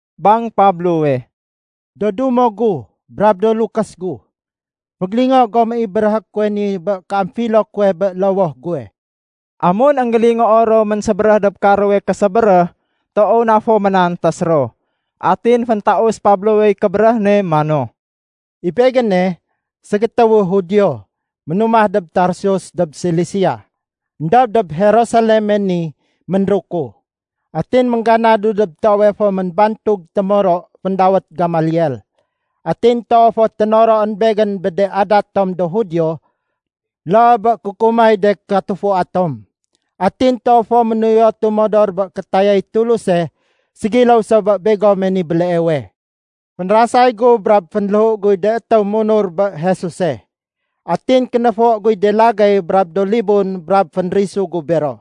Bang Pablowe, “Do dumo gu brab do lukés gu, fégélingo gom i béréhé kuwe ni bé kéamfilo kuwe bé lowoh guwe.” Amun énggélingoo ro ménsébéréh dob karowe késébéréh, toow na fo ménantés ro. Atin féntaus Pablowey kébéréh ne mano, “I begéne, ségétéwu Judio ménumah dob Tarsus dob Silisia. Endob dob Jerusaleme ni ménruku. Atin méngganadu dob toowe fo ménbantug témoro féndawét Gamaliel. Atin toow fo ténoroén begén bé de adat tom do Judio loo bé kukumay de katufua tom. Atin toow fo ménuyotu modor bé kétayay Tuluse ségiléw so bé begome ni béleewe. Fénrasay gu brab fénléhu guy de étéw munur bé Jesuse. Atin kénéfo guy de lagéy brab do libun brab fénrisu gu bero.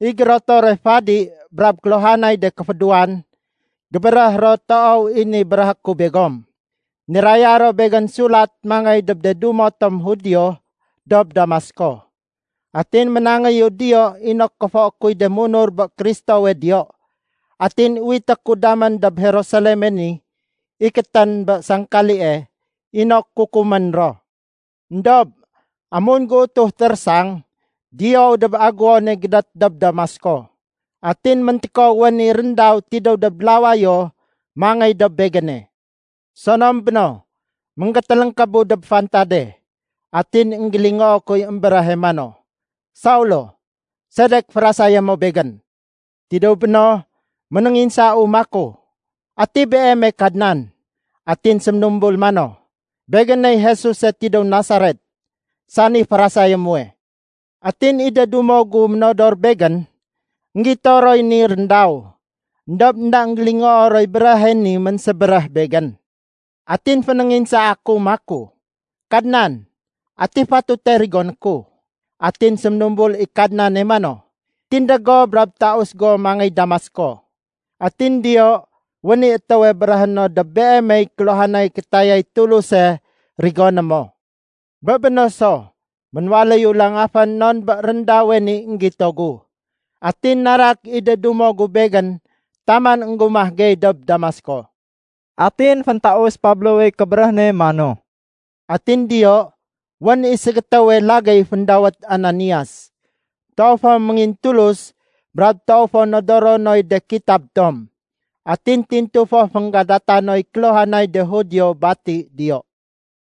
I gérotore fadi brab kéluhanay de kéfédéwan, gébéréh ro toow i ni béréhé ku begom. Niraya ro begén sulat mangéy dob de dumo tom Judio dob Damasko. Atin ménangéyu diyo inok kéfoé kuy de munur bé Kristowe diyo, atin uwité ku damén dob Jerusaleme ni ikétén bé sangkalie inok kukumén ro. “Endob amun géutuh térésang, diyou dob agéwone gédét dob Damasko. Atin méntékow wén i réndaw tidéw dob lawayo mangéy dob begéne. Sonom béno, ménggétéléngkébu dob fantade, atin énggélingoo kuy émbéréhe mano, ‘Saulo! Sedek férasayé mo Begén?’ Tidéw béno ménénginsau maku, ‘Ati beeme Kadnan?’ Atin séménumbul mano, ‘Begéney Jesuse tidéw Nasaret, sani férasayé muwe.’ Atin i de dumo gu ménodor begén, énggito roy ni réndaw éndob énda énggélingoo roy béréhe ni ménsébéréh begén. Atin fénénginsaa ku maku, ‘Kadnan, ati fatute rigoné ku?’ Atin séménumbul i Kadnane mano, ‘Tindég go brab taus go mangéy Damasko. Atin diyo wén i étéwe béréhé no dob beemey kéluhanay kétayay Tuluse rigoné mo.’ Bé béno so, ménwaléyu langafén non bé réndawe ni énggito gu. Atin narak i de dumo gu begén taman énggumah gey dob Damasko.” Atin féntaus Pablowey kébéréh ne mano, “Atin diyo wén i ségétéwe lagéy féndawét Ananias. Toow fo méngintulus brab toow fo nodoro noy de kitab tom. Atin tintu fo fénggadata noy kéluhanay de Judio bati diyo.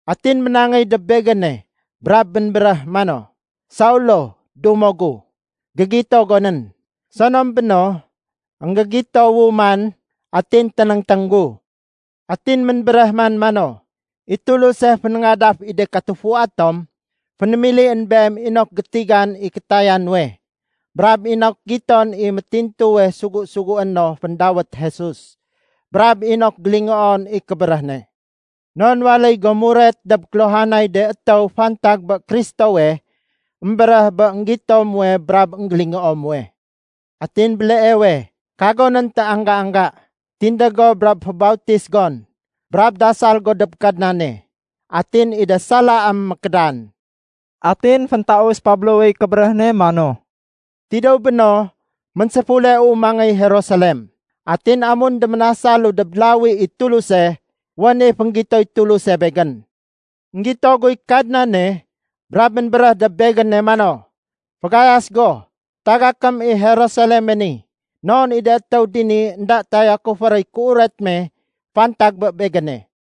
Atin ménangéy dob begéne brab ménbéréh mano, ‘Saulo, dumo gu, gégito gonén!’ Sonom béno, énggégitowu man atin ténéngténg gu. Atin ménbéréh man mano, ‘I Tuluse, fénéngadaf i de katufua tom, fénémilién beem inok gétigan i kétaya nuwe, brab inok giton i métintuwe sugu-sugué no féndawét Jesus, brab inok gélingoon i kébéréh ne. Non waléy go muret dob kéluhanay de étéw fantag bé Kristowe émbéréh bé énggito muwe brab énggélingoo muwe. Atin béleewe, kagonén téangga-angga. Tindég go brab fébautis gon, brab dasal go dob Kadnane. Atin i de salaém mékédan.’” Atin féntaus Pablowey kébéréh ne mano, “Tidéw béno ménséfuleu mangéy Jerusalem. Atin amun déménasalu dob lawi i Tuluse, wén i fénggitoy Tuluse begén. Enggito guy Kadnane brab ménbéréh dob begéne mano, ‘Fagayas go, tagakém i Jerusaleme ni, non i de étéw dini énda tayakufé roy kéuret me fantag bé Begéne.’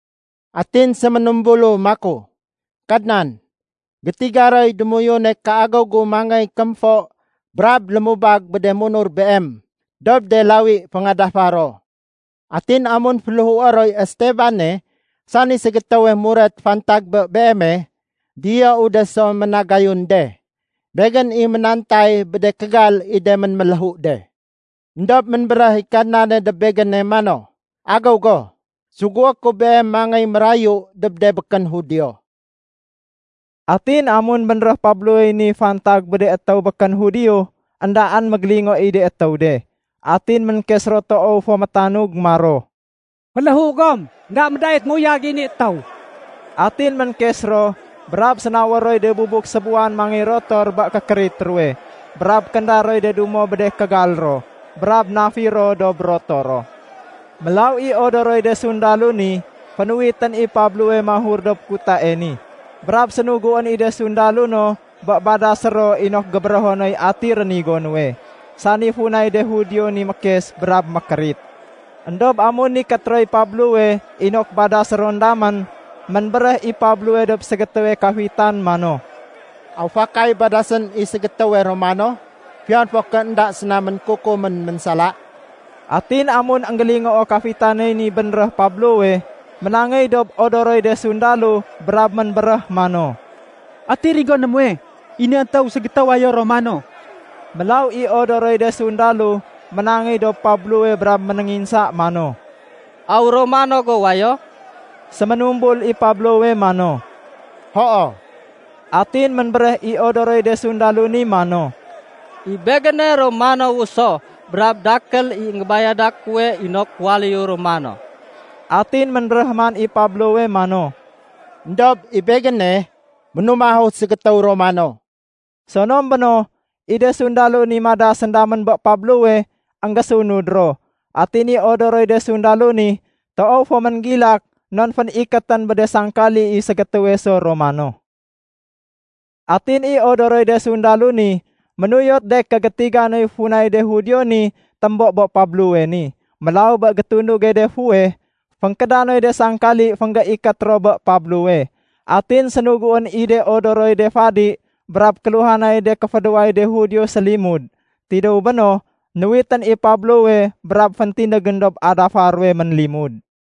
Atin séménumbulu maku, ‘Kadnan, gétiga roy démoyune kéagéw gu mangéy kémfo brab lémubag bé de munur Beem dob de lawi féngadafa ro. Atin amun féléhué roy Estebane sani ségétéwe muret fantag bé Beeme, diyou de so ménagayun de. Begén i ménantay bé de kégal i de ménméléhu de.’ Endob ménbéréh i Kadnane dob begéne mano, ‘Agéw go. Sugué ku beem mangéy mérayu dob de békén Judio.’” Atin amun bénréh Pablowey ni fantag bé de étéw békén Judio, éndaén mégélingo i de étéw de. Atin ménkes ro toow fo métanug maro, “Féléhu gom, énda médait méuyag i ni étéw.” Atin ménkes ro, brab sénawér roy de bubuk sébuwan mangéy rotor bé kékérit ruwe brab kénda roy de dumo bé de kégal ro brab nafir ro dob rotoro. Mélaw i odoroy de sundalo ni, fénuwitén i Pablowe mahur dob kutae ni, brab sénuguén i de sundalo no bé badasé ro inok gébérého noy ati rénigo nuwe, sani funay de Judio ni mékes brab mékérit. Endob amun nikét roy Pablowe inok badasé ron damén, ménbéréh i Pablowe dob ségétéwe kafitan mano, “Aw fakay badasén i ségétéwe Romano fiyon fo ké énda séna ménkukumén ménsala?” Atin amun énggélingooy kafitaney ni bénréh Pablowe, ménangéy dob odoroy de sundalo brab ménbéréh mano, “Ati rigoné muwe? I ni étéw ségétéw wayo Romano.” Mélaw i odoroy de sundalo ménangéy dob Pablowe brab ménénginsa mano, “Aw Romano go wayo?” Séménumbul i Pablowe mano, “Hoo.” Atin ménbéréh i odoroy de sundalo ni mano, “I begéne, Romanowu so. Brab dakél i énggébayada kuwe inok waléyu Romano.” Atin ménbéréh man i Pablowe mano, “Endob i begéne, ménumahu ségétéw Romano.” Sonom béno, i de sundalo ni madasén damén bé Pablowe énggésunud ro. Atin i odoroy de sundalo ni toow fo ménggilak non fénikétén bé de sangkali i ségétéwe so Romano. Atin i odoroy de sundalo ni ménuyot de ké gétiga noy funay de Judio ni témbo bé Pablowe ni. Mélaw bé gétunduge de fuweh, fénkéda noy de sangkali fénggéikét ro bé Pablowe. Atin sénuguén i de odoroy de fadi brab kéluhanay de kéfédéway de Judio sélimud. Tidéw béno, nuwitén i Pablowe brab féntindégén dob adafa ruwe ménlimud.